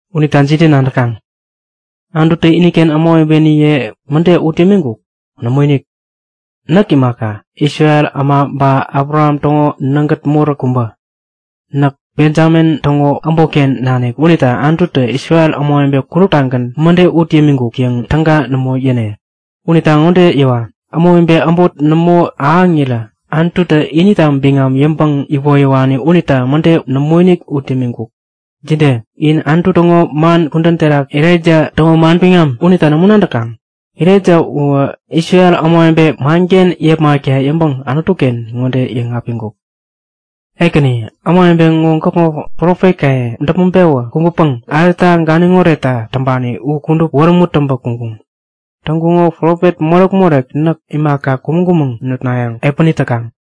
Unita jide nadäkaŋ? Anututä iniken ämawebeniye mäde ut yämiŋkuk? Nämoinik! Näk imaka, Isrel äma ba Abraham täŋo nägät moräk kubä. Näk Benjamin täŋo äbotken nanik unita Anututä Isrel ämawebe kuduptagän mäde ut yämiŋkuk yäŋ täga nämo yäne. Unita ŋode yäwa; Ämawebe äbot nämo ahäŋirä Anututä inita biŋam yäŋpäŋ iwoyäwani unita mäde nämoinik ut yämiŋkuk. Jide? In Anutu täŋo man kudän terak Elaija täŋo manbiŋam unita nämo nadäkaŋ? Elaija uwä Isrel ämawebe manken yepmakta yäŋpäŋ Anutu-ken ŋode yäŋapiŋkuk; Ekäni, ämawebe ŋo gäkŋo profetkaye däpmäŋ-pewä kumbäpäŋ alta ganiŋ oretta täŋpani u kudup wärämut täŋpä kuŋkuŋ. Täŋkuŋo profet morek-morek näk imaka, kumäŋ-kumäŋ nutnayäŋ epäni täkaŋ.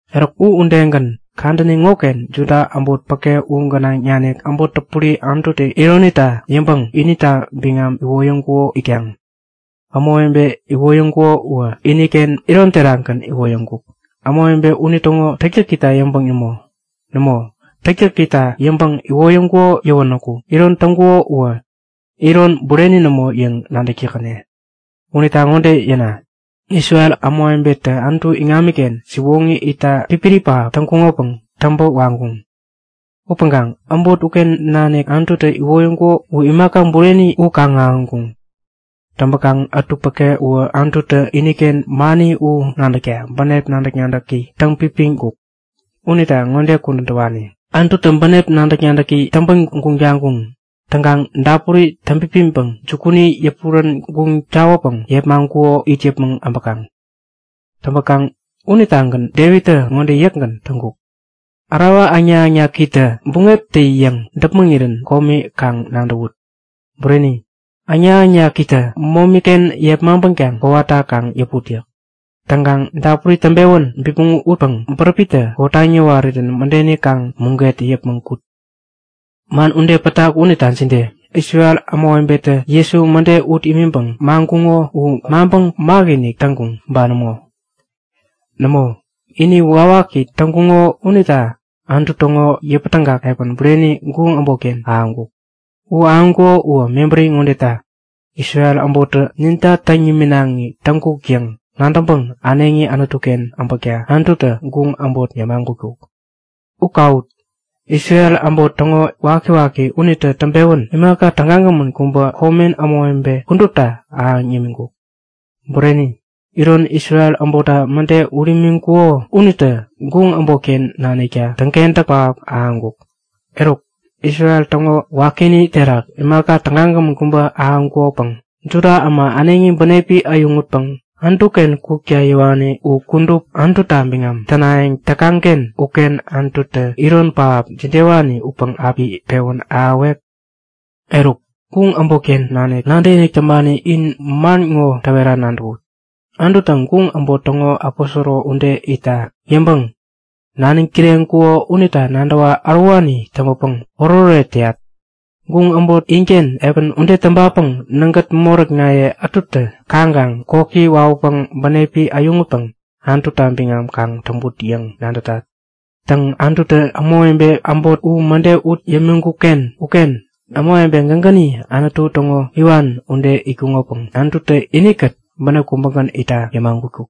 Eruk, u udegän kadäni ŋoken Juda äbot päke u gänaŋ nanik äbot täpuri Anututä ironita yäŋpäŋ inita biŋam iwoyäŋkuko itkaŋ. Ämawebe iwoyäŋkuko uwä, iniken iron terakgän iwoyäŋkuk, ämawebe unitäŋo täktäkita yäŋpäŋ nämo. Nämo, täktäkita yäŋpäŋ iwoyäŋkuko yäwänäku iron täŋkuko uwä iron bureni nämo yäŋ nadäktäkäne. Unita ŋode yäna; Isrel ämawebetä Anutu iŋamiken siwoŋi itta pipiri pähap täŋkuŋopäŋ täŋpä waŋkuŋ. Upäŋkaŋ äbot uken nanik Anututä iwoyäŋkuko u imaka bureni u kaŋ-ahäŋkuŋ. Täŋpäkaŋ ätu päke uwä Anututä iniken mani u nadäkta bänep nadäk-nadäki täŋpipiŋkuk. Unita ŋode kudän täwani; Anututä bänep nadäk-nadäki täŋpän guŋ taŋkuŋ. Täŋkaŋ dapuri täŋpipiŋpäŋ jukuni yäpurän guŋ tawäpäŋ yepmaŋkuko it yäpmäŋ abäkaŋ. Täŋpäkaŋ unitagän Devittä ŋode yäkgän täŋkuk; Ärawa äŋnak-äŋnakitä buŋeptä-yäŋ däpmäŋirän komi kaŋ nadäwut. Bureni, äŋnak-äŋnakitä momi-ken yepmaŋpänkaŋ kowata kaŋ yäput yäk. Täŋkaŋ dapuri täŋpewän bipmäŋ utpäŋ bäräpitä kotaŋ yäwarirän mädeni kaŋ muget yäpmäŋ kut. Man ude pätak unita jide? Isrel ämawebetä Jesu mäde ut imiŋpäŋ maŋkuŋo u maŋpäŋ makinik täŋkuŋ ba nämo? Nämo, ini wakiwaki täŋkuŋo unita Anutu täŋo yäpätägak epän bureni guŋ äbotken ahäŋkuk. U ahäŋkuko uwä mebäri ŋodeta; Isrel äbottä ninta täŋ niminaŋi täŋkuk yäŋ nadäŋpäŋ äneŋi Anutu-ken äbäkta Anututä guŋ äbot yämagutkuk. U kawut! Isrel äbot täŋo wakiwaki unitä täŋpewän imaka tägagämän kubä komen ämawebe kudupta ahäŋ yämiŋkuk. Bureni, iron Isrel äbottä mäde ut imiŋkuŋo unitä guŋ äbotken nanikta täŋkentäk pähap ahäŋkuk. Eruk, Isrel täŋo wakini terak imaka tägagämän kubä ahäŋkukopäŋ Juda äma äneŋi bänepi äyäŋutpäŋ Anutu-ken kukta yäwani u kudup Anututa biŋam tänayäŋ täkaŋ-ken uken Anututä iron pähap jidewani upäŋ api pewän ahäwek? Eruk, guŋ äbotken nanik nadäkinik täŋpani, in man ŋo täwera nadäwut; Anututä guŋ äbot täŋo aposoro ude itta yäŋpäŋ naniŋ kireŋkuko unita nadäwa ärowani täŋpäpäŋ oretoret täyat. Guŋ äbot inken epän ude täŋpapäŋ nägät moräknaye ätutä kaŋkaŋ koki wawäpäŋ bänepi äyäŋutpäŋ Anututa biŋam kaŋ täŋput yäŋ nadätat. Täŋ, Anututä ämawebe äbot u mäde ut yämiŋkuk-ken uken ämawebe gägäni Anutu täŋo iwan ude itkuŋopäŋ Anututä inikät bänep kubägän itta yämagutkuk.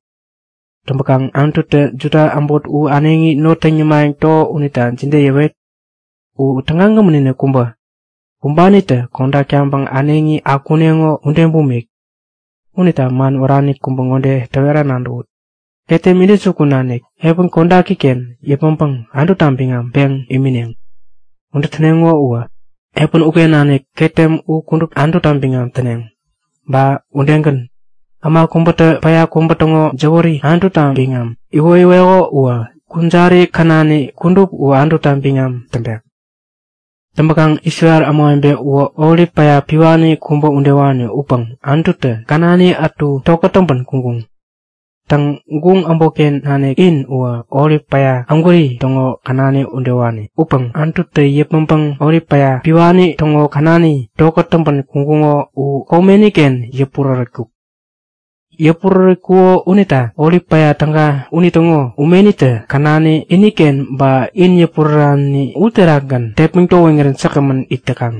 Täŋpäkaŋ Anututä Juda äbot u äneŋi not täŋ yämayäŋ täko unita jide yäwet? U tägagämän-inik kubä, kumbanitä kodak taŋpäŋ äneŋi akuneŋo ude bumik. Unita man wärani kubä ŋode täwera nadäwut; Ketem intäjukun nanik epän kodaki-ken yäpmäŋpäŋ Anututa biŋam peŋ imineŋ. Ude täneŋo uwä epän uken nanik ketem u kudup Anututa biŋam täneŋ. Ba udegän, äma kubätä päya kubä täŋo jäwäri Anututa biŋam iwoyäweko uwä kujari känani kudup u Anututa biŋam täŋpek. Täŋpäkaŋ Isrel ämawebe uwä olip päya piwani kubä udewani upäŋ Anututä känani ätu tokät täŋpän kuŋkuŋ. Täŋ, guŋ äbotken nanik in uwä olip päya ägwäri täŋo känani udewani upäŋ Anututä yäpmäŋpäŋ olip päya piwani täŋo känani tokät täŋpän kuŋkuŋo u komeni-ken yäpurärätkuk. Yäpurärätkuko unita olip päya täga unitäŋo umenitä känani, iniken ba in yäpurärani uterakgän tepmäŋ towiŋirän säkgämän it täkaŋ.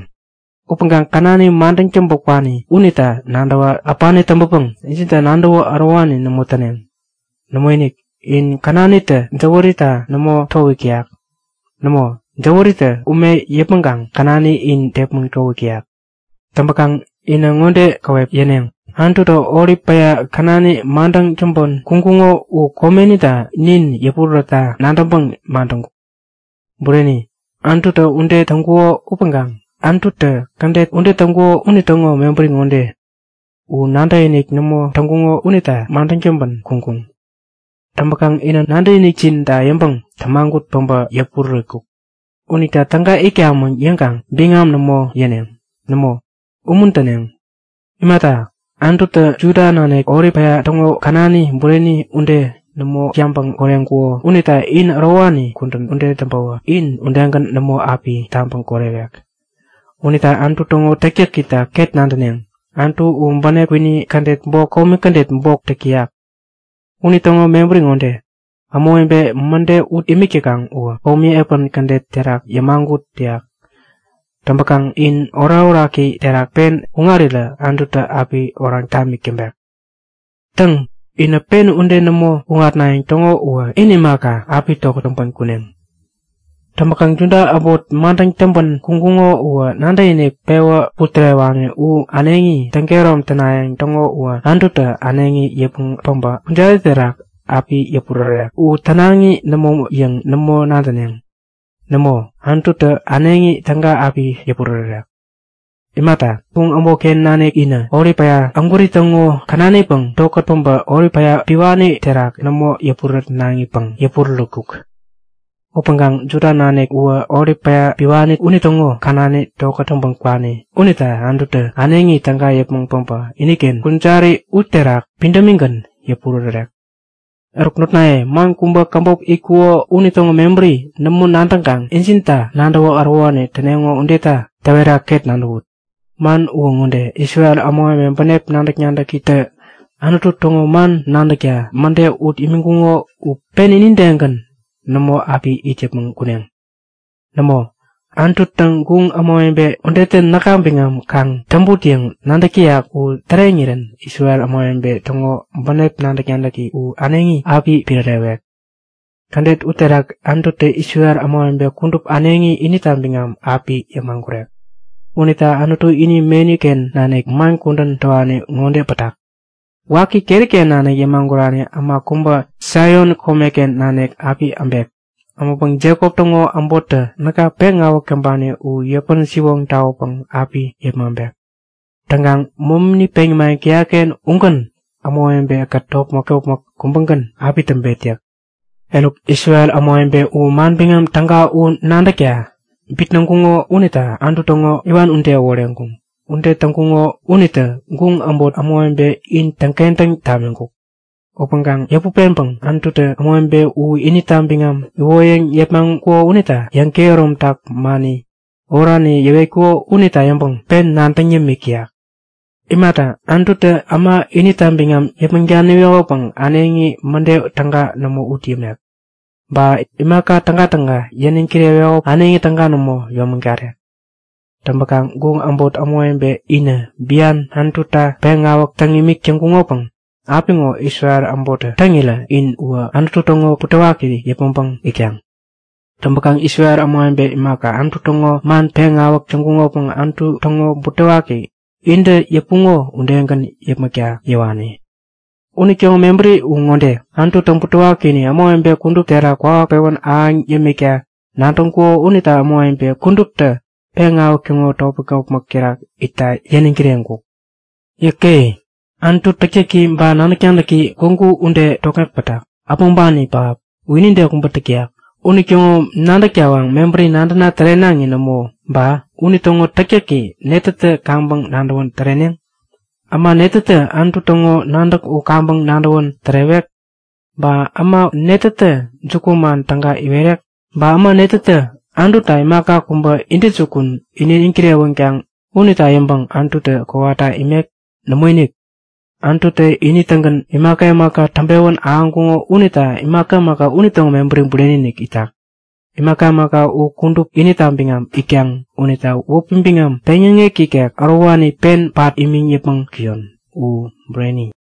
Upäŋkaŋ känani madäŋ täŋpä kwani unita nadäwä äpani täŋpäpäŋ injinta nadäwä ärowani nämo täneŋ. Nämoinik, in känanitä jäwärita nämo towik täyak. Nämo, jäwäritä ume yäpmäŋkaŋ känani in tepmäŋ towik täyak. Täŋpäkaŋ inä ŋode käwep yäneŋ; Anututä olip päya känani madäŋ täŋpän kuŋkuŋo u komenita nin yäpurärätta nadäŋpäŋ madäŋkuk. Bureni, Anututä ude täŋkuko upäŋkaŋ Anututä kädet ude täŋkuko unitäŋo mebäri ŋode; U nadäkinik nämo täŋkuŋo unita madäŋ täŋpän kuŋkuŋ. Täŋpäkaŋ inä nadäkinikjinta yäŋpäŋ tämagut päbä yäpurärätkuk. Unita täga itkamäŋ yäŋkaŋ biŋam nämo yäneŋ. Nämo, umuntäneŋ! Imata, Anututä Juda nanik, olip päya täŋo känani bureni ude nämo yabäŋ koreŋkuko unita in ärowani kudän ude täŋpäwä in udegän nämo api tabäŋ korewek. Unita Anutu täŋo täktäkita ket nadäneŋ; Anutu u bänep kwini kädet bok, komi kädet bok täk täyak. Unitäŋo mebäri ŋode; Ämawebe mäde ut imik täkaŋ uwä komi epän kädet terak yämagut täyak. Täŋpäkaŋ in orakoraki terak pen kuŋarirä Anututä api oraŋ tamik täŋpek. Täŋ, inä ude pen nämo kuŋatnayäŋ täŋo uwä in imaka, api tokät täŋpän kuneŋ. Täŋpäkaŋ Juda äbot madäŋ täŋpän kuŋkuŋo uwä nadäkinik pewä putärewani u äneŋi täŋkehärom tänayäŋ täŋo uwä Anututä äneŋi yäpmäŋ päbä kujarini terak api yäpurärärek. U tänaŋi nämo yäŋ nämo nadäneŋ. Nämo, Anututä äneŋi täga api yäpurärärek. Imata, guŋ äbotken nanik inä olip päya ägwäri täŋo känanipäŋ tokät päbä olip päya piwani terak nämo yäpurärätnaŋipäŋ yäpurärätkuk. Upäŋkaŋ Juda nanik uwä olip päya piwani unitäŋo känani tokät täŋpän kwani unita Anututä äneŋi täga yäpmäŋ päbä iniken kujari uterak pidämigän yäpurärärek. Eruk notnaye, man kubä käbop itkuko unitäŋo mebäri nämo nadäŋkaŋ injinta nadäwä ärowani täneŋo udeta täwera ket nadäwut; Man uwä ŋode; Isrel ämawebe bänep nadäk-nadäkitä Anutu täŋo man nadäkta mäde ut imiŋkuŋo u pen inidegän nämo api it yäpmäŋ kuneŋ. Nämo, Anututä guŋ ämawebe udetä näka biŋam kaŋ täŋput yäŋ nadäk täyak u täreŋirän Isrel ämawebe täŋo bänep nadäk-nadäki u äneŋi api pirärewek. Kädet uterak Anututä Isrel ämawebe kudup äneŋi inita biŋam api yämagurek. Unita Anutu ini meni-ken nanik man kudän täwani ŋode pätak; Waki keri-ken nanik yämagurani äma kubä Saion komeken nanik api äbek. Äbäŋpäŋ Jekop täŋo äbottä näka peŋawäk täŋpani u yäpän-siwoŋ tawäpäŋ api yepmaŋpek. Täŋkaŋ momini peŋ yämayäŋ täyat-ken ugän ämawebe-kät topmäk-topmäk kubägän u api täŋpet yäk. Eruk, Isrel ämawebe u Manbiŋam Täga u nadäkta bitnäŋkuŋo unita Anutu täŋo iwan ude äworeŋkuŋ. Ude täŋkuŋo unitä guŋ äbot ämawebe in täŋkentäŋ tamiŋkuk. Upäŋkaŋ yäput peŋpäŋ Anututä ämawebe u inita biŋam iwoyäŋ yepmaŋkuko unita yäŋkehäromtak mani oraniye yäwetkuko unita yäŋpäŋ pen nadäŋ yämik täyak. Imata, Anututä äma inita biŋam yäpmäŋ daniwekopäŋ äneŋi mäde täga nämo ut yämek. Ba imaka tägatäga yäniŋ kirewekopäŋ äneŋi täga nämo yäyomägarek. Täŋpäkaŋ guŋ äbot ämawebe inä bian Anututa peŋawäk täŋ imik täŋkuŋopäŋ apiŋo Isrel äbottä täŋirä in uwä Anutu täŋo butewakini yäpmäŋpäŋ itkaŋ. Täŋpäkaŋ Isrel ämawebe imaka, Anutu täŋo man peŋawäk täŋkuŋopäŋ Anutu täŋo butewaki intä yäpuŋo udegän yäpmäkta yäwani. Unitäŋo mebäri u ŋode; Anututä butewakini ämawebe kudup terak kwawak pewän ahäŋ yämikta nadäŋkuko unita ämawebe kuduptä peŋawäk täŋo topmäk-topmäk terak itta yäniŋ kireŋkuk. Yäke! Anutu täktäki ba nadäk-nadäki gwägu ude tokŋek pätak, äpmoŋpani pähap! U inide kubä täk täyak. Unitäŋo nadäk tawaŋ mebäri nadäna tärenaŋi nämo ba unitäŋo täktäki netätä kaŋpäŋ nadäwän täreneŋ? Äma netätä Anutu täŋo nadäk u kaŋpäŋ nadäwän tärewek? Ba äma netätä jukuman täga iwerek? Ba äma netätä Anututa imaka kubä intäjukun iniŋ kirewänkaŋ unita yäŋpäŋ Anututä kowata imek? Nämoinik! Anututä ini-tägän imaka imaka täŋpewän ahäŋkuŋo unita imaka imaka unitäŋo mebäri bureni-inik itak. Imaka imaka u kudup inita biŋam itkaŋ. Unita wäpi biŋam peŋyäŋek ikek ärowani pen pat imiŋ yäpmäŋ kuyon! U Bureni.